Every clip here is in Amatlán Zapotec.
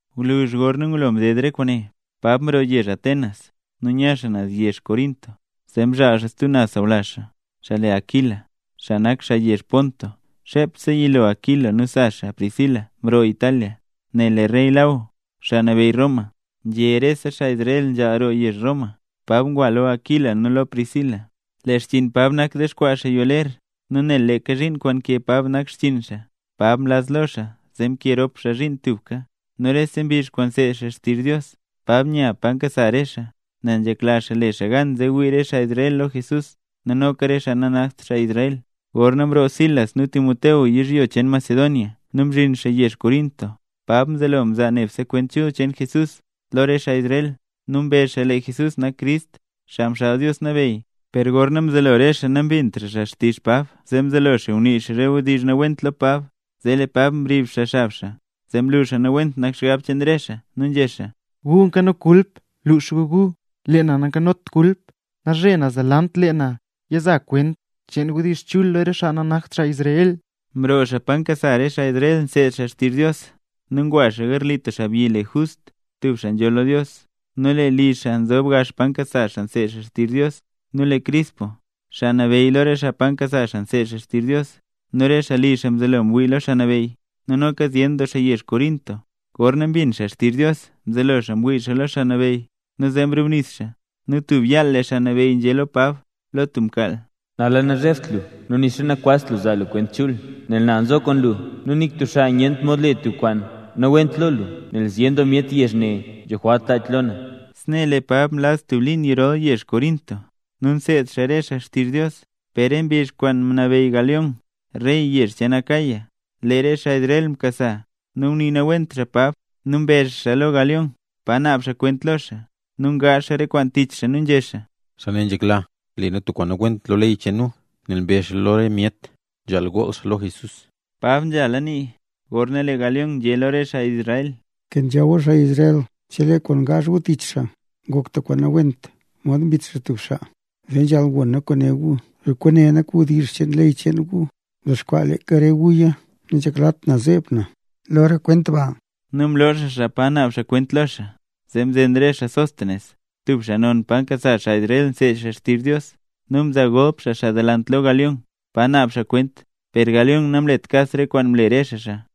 Gwluzh gorna ngulo mdedla re kwaane, Pab mroo yezh Atenas nu nya xaa naz yezh Corinto. Zee mzhaal xaa tub sawlazh xaa, xaa le Aquila, xaa nak xaa yezh Ponto. Xepse yilo Aquila nu sa xaa Priscila mroo Italia, nel lee rey Law, xaa nabeyy Roma, nzhé lee rese xaa Israel nzhaal roo yezh Roma. Pab ngwa lo Aquila nu Priscila. Lee xchiin Pab nak dexkwaa xaa yoo ler. Nu nel leeka zhiin kwaan nkee Pab nak xchiin xaa, Pab mlaz lo xaa zee mkee rop xaa zhiin tubka. Nu rese mbizh kwaan nseed xaa xtizh Dios, Pab nya pa nkasa re xaa, nel nzhekla xaa le xaa gan zee wii re xaa Israel lo Jesús nu noka re xaa nanakt xaa Israel. Gorna mroo Silas nu Timoteo yizhyo cheen Macedonia nu mzhin xaa yezh Corinto, Pab mzelo mzaa nebse kwent chul cheen Jesús lo re xaa Israel, nu mbezh xaa lee Jesús nak Crist, Xaa Mxaal Dios Nabeyy. Per gorna mzelo re xaa nambintra xaa xtizh Pab zee mzelo xaa ngunii xaa re wdizh nawent lo Pab, zee Pab mrib xaa xab xaa, zee mlu Pab nawent nak xgab cheen re xaa, nu nzhé xaa: —Gu nkano kulp lux gu gu, lee na nankanot kulp. Nalzhe naz delant, lee na ya za kwent cheen wdizh chul lo re xaa nanakt xaa Israel. Mroo xaa pa nkasa re xaa Israel nseed xaa xtizh Dios nu ngwa xaa garli tub xaabyi le Just, tub xaa nzhool lo Dios. Nu lee li xaa nzob gax pa nkasa xaa nseed xaa xtizh Dios. Nu lee Crispo, xaa nabeyy lo re xaa pa nkasa xaa nseed xaa xtizh Dios, nu re xaa li xaa mzelo ngwii lo Xaa Nabeyy. Nu noka zyen doo xaa yezh Corinto, gorna mbin xaa xtizh Dios mzelo xaa ngwii lo Xaa Nabeyy nu zee mrubnis xaa. Nu tub yaal lee Xaa Nabeyy nzhé lo Pab lo tub mkaal: —Nala nazhebt lu, nu nixa nakwazt lu zaa lu kwent chul, nel na nzo kwaan lu, nu nik tub xaa nyent mod le tub kwaan nawent lo lu, nel zyen doo myet yezh ne nzho jwalt lach lo na. Snee lee Pab mlaz tub liin yirol yezh Corinto, nu nseed xaa re xaa xtizh Dios. Per re mbizh kwaan mnabeyy Galión re yezh cheen Acaya, lee re xaa Israel mkasa nu ngunii nawent xaa Pab, nu mbe xaa xaa lo Galión pa naab xaa kwent lo xaa. Nu ngaazh re xaa kwaan tich xaa nu nzhé xaa: —Xaa ne nzhekla le nu tub kwaan nawent lo ley cheen nu, nel mbezh xaa lo re myet nzhaal gool xaa lo Jesús. Pab nzhala nii gorna lee Galión nzhé lo re xaa Israel: —Nkenzha gu na xaa Israel, chelee kwaan ngaazh gu tich xaa ngok tub kwaan nawent mod mbit xaa tub xaa, zee nzhaal gon na kwaan né gu. Per kwaane nak wdizh cheen ley cheen gu, mdexkwaa leeka re guya, nanzheklat na zeeb na lo re kwent ba. Nu mloo xaa xaa lo pa naab xaa kwent. Zee mzen re xaa Sóstenes, tub xaa non pa nkasa xaa Israel nseed xaa xtizh Dios, nu mzaa golp xaa xaa delant lo Galión, pa naab xaa kwent. Per Galión namlet kas re kwaan mle re xaa xaa.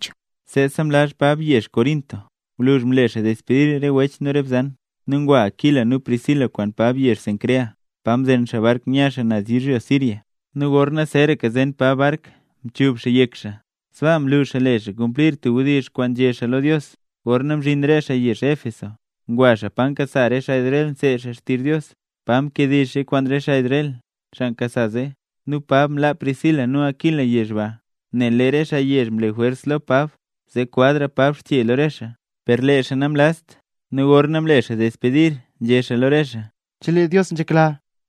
Seese mlazra Pab zyen mbizh yezh Corinto. Gwluzh mle xaa despedir re wech nu re bzan, nu ngwa Aquila nu Priscila kwaan Pab yezh Cencrea pa mzen xaa bark nu nya xaa naz yizhyo Siria. Nu gorna zeeraka zen Pab bark mchub xaa yek xaa, sbaa mlu xaa le xaa kumplir tub wdizh kwaan nzhé xaa lo Dios. Gorna mzhin re xaa yezh Éfeso ngwa xaa pa nkasa xaa Israel nseed xaa xtizh Dios, pa mkediizh xaa kwaan re xaa Israel, xaa nkasa zee. Nu Pab mlaa Priscila nu Aquila yezh ba, nel lee re xaa yezh mle jwers lo Pab zee kwazra Pab xche lo re xaa, per lee xaa namlazt. Nu gorna mle xaa despedir nzhé xaa lo re xaa: —Chelee Dios nzhekla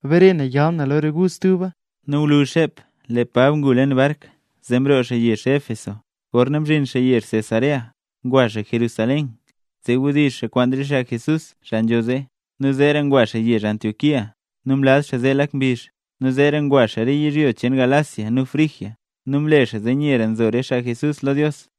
bare na yal na lo re gu stuba. Nu gwluzh xep, lee Pab ngu leen bark nu mroo xaa yezh Éfeso. Gorna mzhin xaa yezh Cesarea, ngwa xaa Jerusalén zee wdizh xaa kwaan re xaa Jesús, xaa nzho zee, nu zeera ngwa xaa yezh Antioquía. Nu mlaz xaa zee lak mbizh, nu zeera ngwa xaa re yizhyo cheen Galacia nu Frigia nu mle xaa zee nyera nzo re xaa Jesús lo Dios.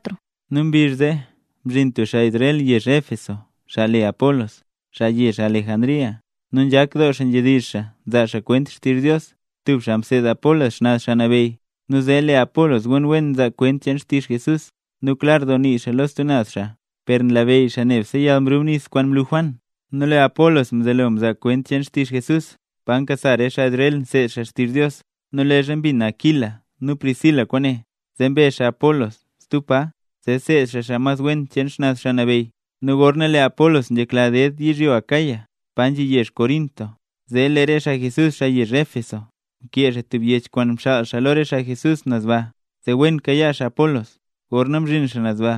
Nu mbizh zee mzhin tub xaa Israel yezh Éfeso, xaa le Apolos, xaa yezh Alejandría. Nu nzhak doo xaa nzhedizh xaa nzaa xaa kwent xtizh Dios. Tub xaa mseed Apolos xnaz Xaa Nabeyy, nu zee lee Apolos wen nzaa kwent cheen xtizh Jesús nu klar doo nii xaa lo stub naz xaa, per nlabeyy xaa nebse yalmrubnis kwaan mlu Juan. Nu lee Apolos mzelo mzaa kwent cheen xtizh Jesús pa nkasa re xaa Israel nseed xaa xtizh Dios. Nu leezha mbin Aquila nu Priscila kwaane, zee mbe xaa Apolos stub pa zee seed xaa xaa mas cheen xnaz Xaa Nabeyy. Nu gorna lee Apolos nzhekla ded yizhyo Acaya pa nzhi yezh Corinto, zee lee re xaa Jesús yezh Éfeso mkee xaa tub yech kwaan mxaal xaa lo re xaa Jesús naz ba zee wen kayaa xaa Apolos. Gorna mzhin xaa naz ba,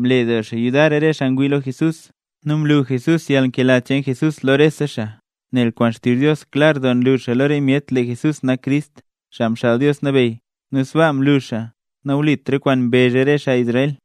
mle doo xaa yudar rese xaa ngwii lo Jesús, nu mlu Jesús yalnkela cheen Jesús lo rese xaa. Nel kwaan xtizh Dios klar doo nlu xaa lo re myet lee Jesús nak Crist, Xaa Mxaal Dios Nabeyy; nu sbaa mlu xaa nawlit re kwaan mbezh re xaa Israel.